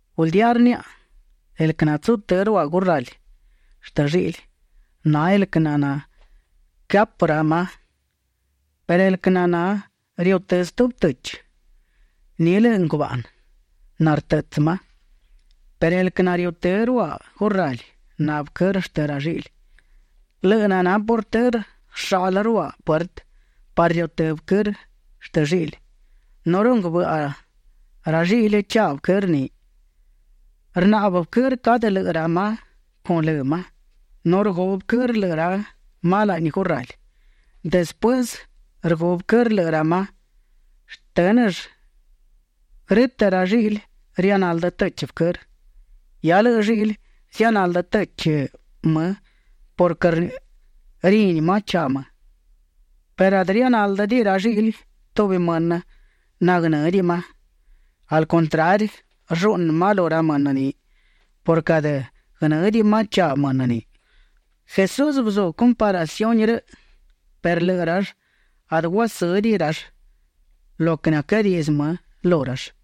’Guldía rniaꞌa, el quë natsutë́ ruaꞌ gurrali shtë lliꞌli, na el quë naquëhapë ra ma; perë el quë naná riutë́ stubi tëchi, ni lëꞌë ngubaꞌnë nartëꞌtsë ma. Perë el quë nariutë́ ruaꞌ gurrali, na vëquërë shtë ra lliꞌli. Lëꞌë naná portërë rsháꞌlëll ruaꞌ puertë parë riutë́ vëquërë shtë lliꞌli. Nu runguë bëꞌa ra lliꞌli chaꞌ vëquërë ni. Rnaꞌbë vëquërë cadë lëꞌë ra ma con lë ma. Nu rgu vëquërë lëꞌë ra ma laꞌni gurrali. Despuësë rgu vëquërë lëꞌë ra ma shtë́nëll, grë́tëꞌ ra lliꞌli rianaldë tëchi vëquërë. Hia lëꞌë lliꞌli zianaldë tëchi më purquë rini ma chaꞌ më perë adë rianáldëdiꞌi ra lliꞌli tubi mënë naguënë́diꞌi ma. Al contrari, rlluꞌnë ma lu ra mënë ni purquë adë guënë́diꞌi ma chaꞌ mënë ni. Jesús bëzú comparaciuni rëꞌ perë lëꞌë rall adë guasë́diꞌi rall lo quë naquëadiꞌdzë më lu rall.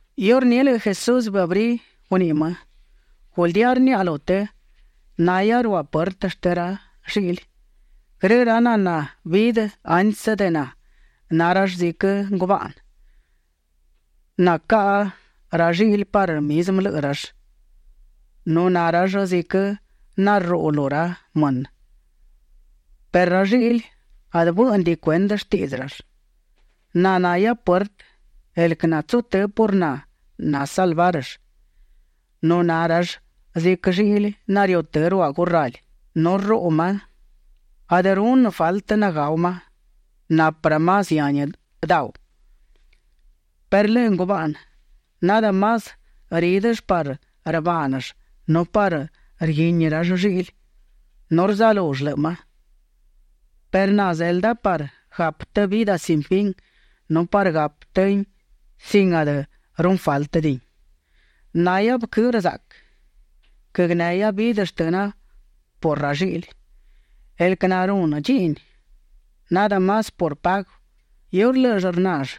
Iurní lëꞌë Jesús bëabrí guniꞌi më: ―Guldía rniaꞌa lu të, nahia ruaꞌ puertë shtë ra lliꞌli. Grë ra naná bidë antsë de na, na rall ziquë ngubaꞌnë nacaꞌa ra lliꞌli parë mizmë lëꞌë rall, nu na rall ziquë narruꞌu lu ra mënë, perë ra lliꞌli adë bë́ꞌnëdiꞌi cuendë shtiꞌdzë rall. Na nahia puertë; el quë natsutë́ por na nasalvárëll, nu na rall ziquë lliꞌli nariutë́ ruaꞌ gurrali nu rruꞌu ma; adë runë faltë nagáu ma. Napë ra ma zihani dau. ’Perë lëꞌë ngubaꞌnë nadë más rídëll parë rbaaꞌnëll nu parë rguínill ra lliꞌli nu rzalull lëꞌë ma; perë na zelda parë gapë të vidë sin fin nu parë gapë tëhin sin adë runë fáltëdiꞌin. Nahia vëquërë zaꞌquë. Guënehia vidë shtëna por ra lliꞌli. El quë narunë dchiꞌni nadë más por pagu, iurë lë́ꞌëll rnall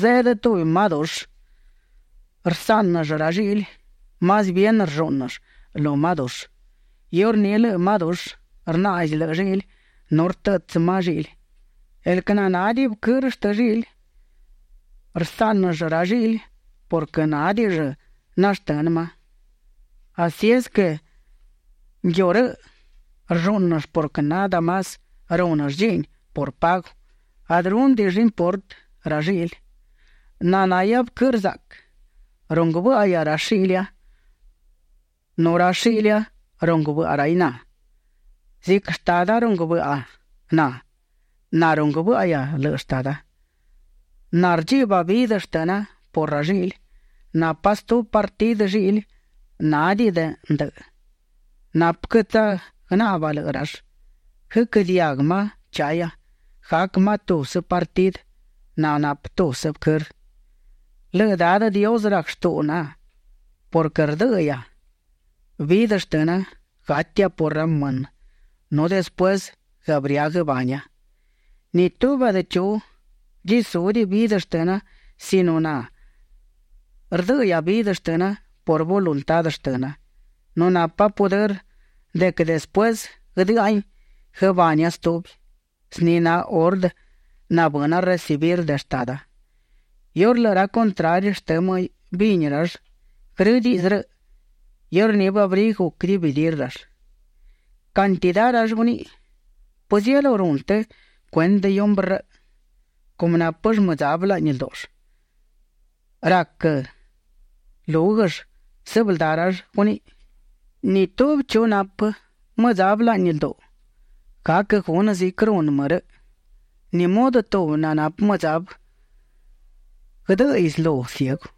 zeꞌdë tubi ma dushë, rsáꞌnëll ra lliꞌli; más bien rllúꞌnëll lu ma dushë. Iurní lëꞌë ma dushë rnaꞌzi lëꞌë lliꞌli nu rtëꞌtsë ma lliꞌli. El quë nádiꞌi vëquërë shtë lliꞌli, rsáꞌnëll ra lliꞌli purquë nádiꞌill nashtënë ma. Así es quë nguiu rëꞌ rllúꞌnëll purquë nadë más rúnëll dchiꞌni por pagu; adë rúnëdiꞌill importë ra lliꞌli. ’Na nahia vëquërë zaꞌquë. Runguë bë́ꞌahia ra shiꞌlia nu ra shiꞌlia runguë bëꞌa raiꞌ na. Ziquë Shtada runguë bëꞌa na, na runguë bë́ꞌahia lëꞌë Shtada. Na rdchiꞌba vidë shtëna por ra lliꞌli. Napa stubi partidë lliꞌli nanádiꞌi ndëꞌë; napë quë tsagnaꞌba lëꞌë rall. Guëquë́ diaguë ma chahia; gac ma tubsë partidë nanapë tubsë vëquërë. ’Lëꞌë Dadë Dios rac shtuꞌu na purquë rdë́ꞌëhia vidë shtëna; gatia por ra mënë nu despuësë guëabrí guëbania. Ni tubi adë chu guëdchisúdiꞌi vidë shtëna sino na rdë́ꞌëhia vidë shtëna por voluntá shtëna, nu napa pudërë de quë despuësë guëdë́ꞌahin, guëbania stubi. Zni na ordë nabëna recibir de Shtada. Iurë ra contrari shtë më bini rall grë diꞌdzë rëꞌ, iurní bëabrí guc dividir rall. Cantidá rall guniꞌi: ―¿Pëzielú runë të cuendë hiumbrë rëꞌ? cumë nápëll mëdzabë laꞌni ldúꞌull. Rac lúguëll. Sëbëldá rall guniꞌi: ―Ni tubi chu nanapë mëdzabë laꞌni lduꞌu, gac gunë ziquë runë më rëꞌ. ¿Ni mudë tubi nanapë mëdzabë guëdë́ꞌëiꞌ slu ciegú?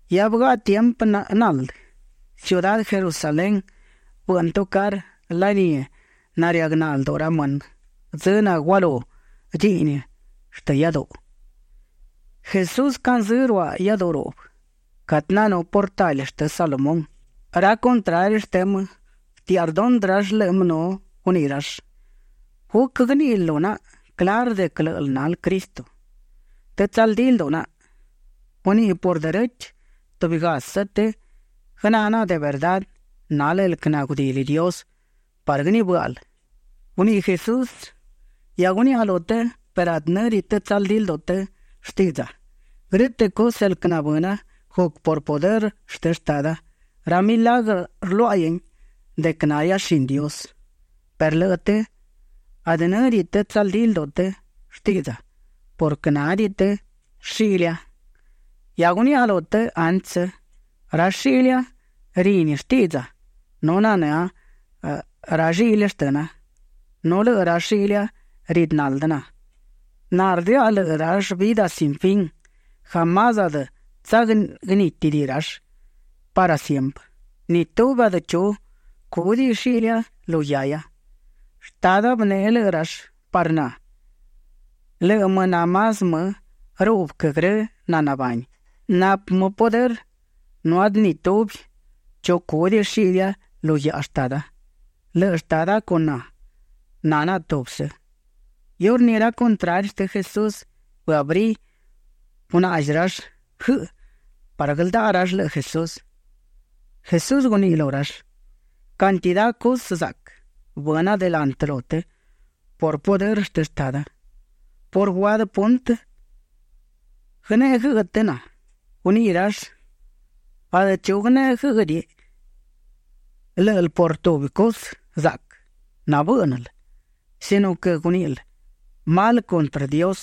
Hia bëgaꞌa tiempë naldë. Ciudá Jerusalén bëꞌnë tucarë laní narëagná lduꞌu ra mënë dzë nagualú dchiꞌni shtë iáduꞌu. Jesús canzë́ ruaꞌ iáduꞌu ruꞌbë catë nanú portali shtë Salomón. Ra contrari shtë më bëtiaꞌa rdondë rall lëꞌë më nu guniꞌi rall: ―¿Guc guëníꞌil lu naꞌa clarë de quë lë́ꞌël nal Cristo? të tsaldí lduꞌu naꞌa. Guniꞌi por derechë tubigasë të guënë́ naꞌa de verdá nal el quë nagudili Dios parë guënibë́ꞌal. Guniꞌi Jesús: ―Hia guniaꞌa lu të perë adë në́diꞌi të tsaldí lduꞌu të shtiꞌdza. Grë́tëꞌ cusë el quë nabëna, guc por pudërë shtë Shtada; ra milagrë rluaꞌain de quë nahia shini Dios perë lëꞌë të adë në́diꞌi të tsaldí lduꞌu të shtiꞌdza purquë nádiꞌi të shiꞌlia. Hia guniaꞌa lu të antsë. Ra shiꞌlia rini shtiꞌdza nu nanë́a ra lliꞌli shtëna, nu lëꞌë ra shiꞌlia ridë naldë na. Na rdëꞌa lëꞌë rall vidë sin fin; jamás adë tsagnítidiꞌi rall parë siemprë. Ni tubi adë chu cúdiꞌi shiꞌlia lu guiahia. Shtada bëneꞌe lëꞌë rall parë na. Lëꞌë më na más më ruꞌbë quë grë nanabani. Napë më pudërë nu adë ni tubi chu cúdiꞌi shiꞌlia lu guiaꞌa Shtada. Lëꞌë Shtada con na, na naꞌa tubsë. Iurní ra contrari shtë Jesús bëabrí gunaꞌzi rall guëꞌë parë guëldaꞌa rall lëꞌë Jesús. Jesús guniꞌi lu rall: ―Cantidá cusë zaꞌquë bëna delantë lu të por pudërë shtë Shtada, ¿por guadë puntë naguëneꞌe guëꞌë të na? Guniꞌi rall: ―Adë chu guënéꞌediꞌi guëꞌë lë́ꞌël por tubi cusë zaꞌquë nabë́ꞌnël sino quë guníꞌil mal cuntrë Dios.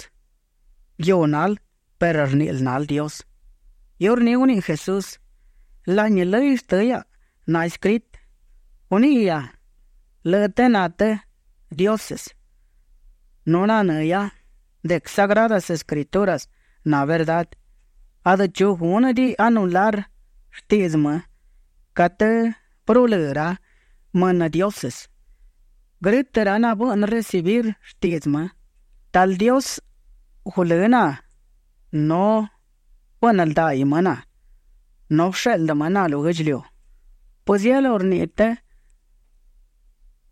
Nguiu nal perë rníꞌil nal Dios. Iurní guniꞌi Jesús: ―Laꞌni lëy shtë hiaꞌa naescritë: “Guníꞌihia lëꞌë të na të dioses”, nu nanë́ hiaꞌa de quë Sagradas Escrituras na verdá, adë chu gúnëdiꞌi anular shtiꞌdzë më catë bërulë́ ra mënë dioses, grë́tëꞌ ra nabëꞌnë recibir shtiꞌdzë më. Talë Dios gulë́ na nu bëꞌnë ldaiꞌ më na nu bësheꞌldë më na lu guë́ꞌdchiliu, ¿pëzielú rniꞌi të de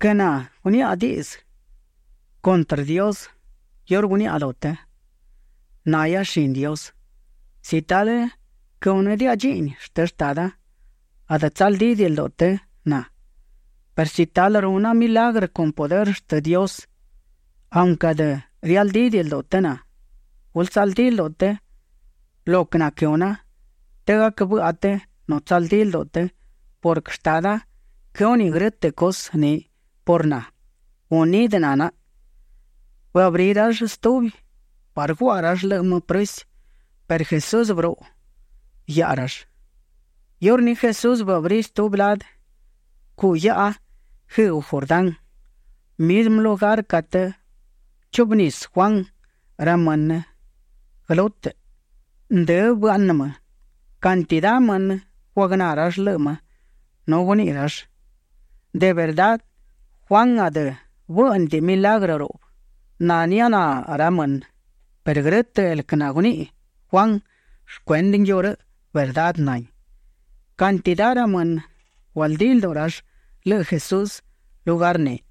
quë na guniaꞌa diꞌdzë cuntrë Dios iurë guniaꞌa lu të: “Nahia shini Dios”? Si talë quëhúnëdiaꞌa dchiꞌni shtë Shtada, adë tsaldídiꞌi lduꞌu të na. Perë si talë runa milagrë con pudërë shtë Dios, aunquë adë rialdídiꞌi lduꞌu të na, gulë tsaldí lduꞌu të lo quë naquëhuna të gac bëꞌa të nu tsaldí lduꞌu të purquë Shtada quëhúniꞌ grë́tëꞌ cusë ni por na; unidë na naꞌa. Bëabrí rall stubi parë guaꞌa rall lëꞌë më prësi perë Jesús bëruꞌu guiaꞌa rall. Iurní Jesús bëabrí stubi ladë cuꞌ guiaꞌa guëëꞌgu Jordán, mizmë lugar catë bëchuꞌbë nisë Juan ra mënë guëlútëꞌ. Ndë bëaꞌnë më. Cantidá mënë guagná rall lëꞌë më nu guniꞌi rall: ―De verdá Juan adë bë́ꞌnëdiꞌiꞌ milagrë ruꞌbë nanianá ra mënë perë grë́tëꞌ el quë naguniꞌi Juan shcuendë nguiu rëꞌ, verdá nahin. Cantidá ra mënë gualdí lduꞌu rall lëꞌë Jesús lugar ni.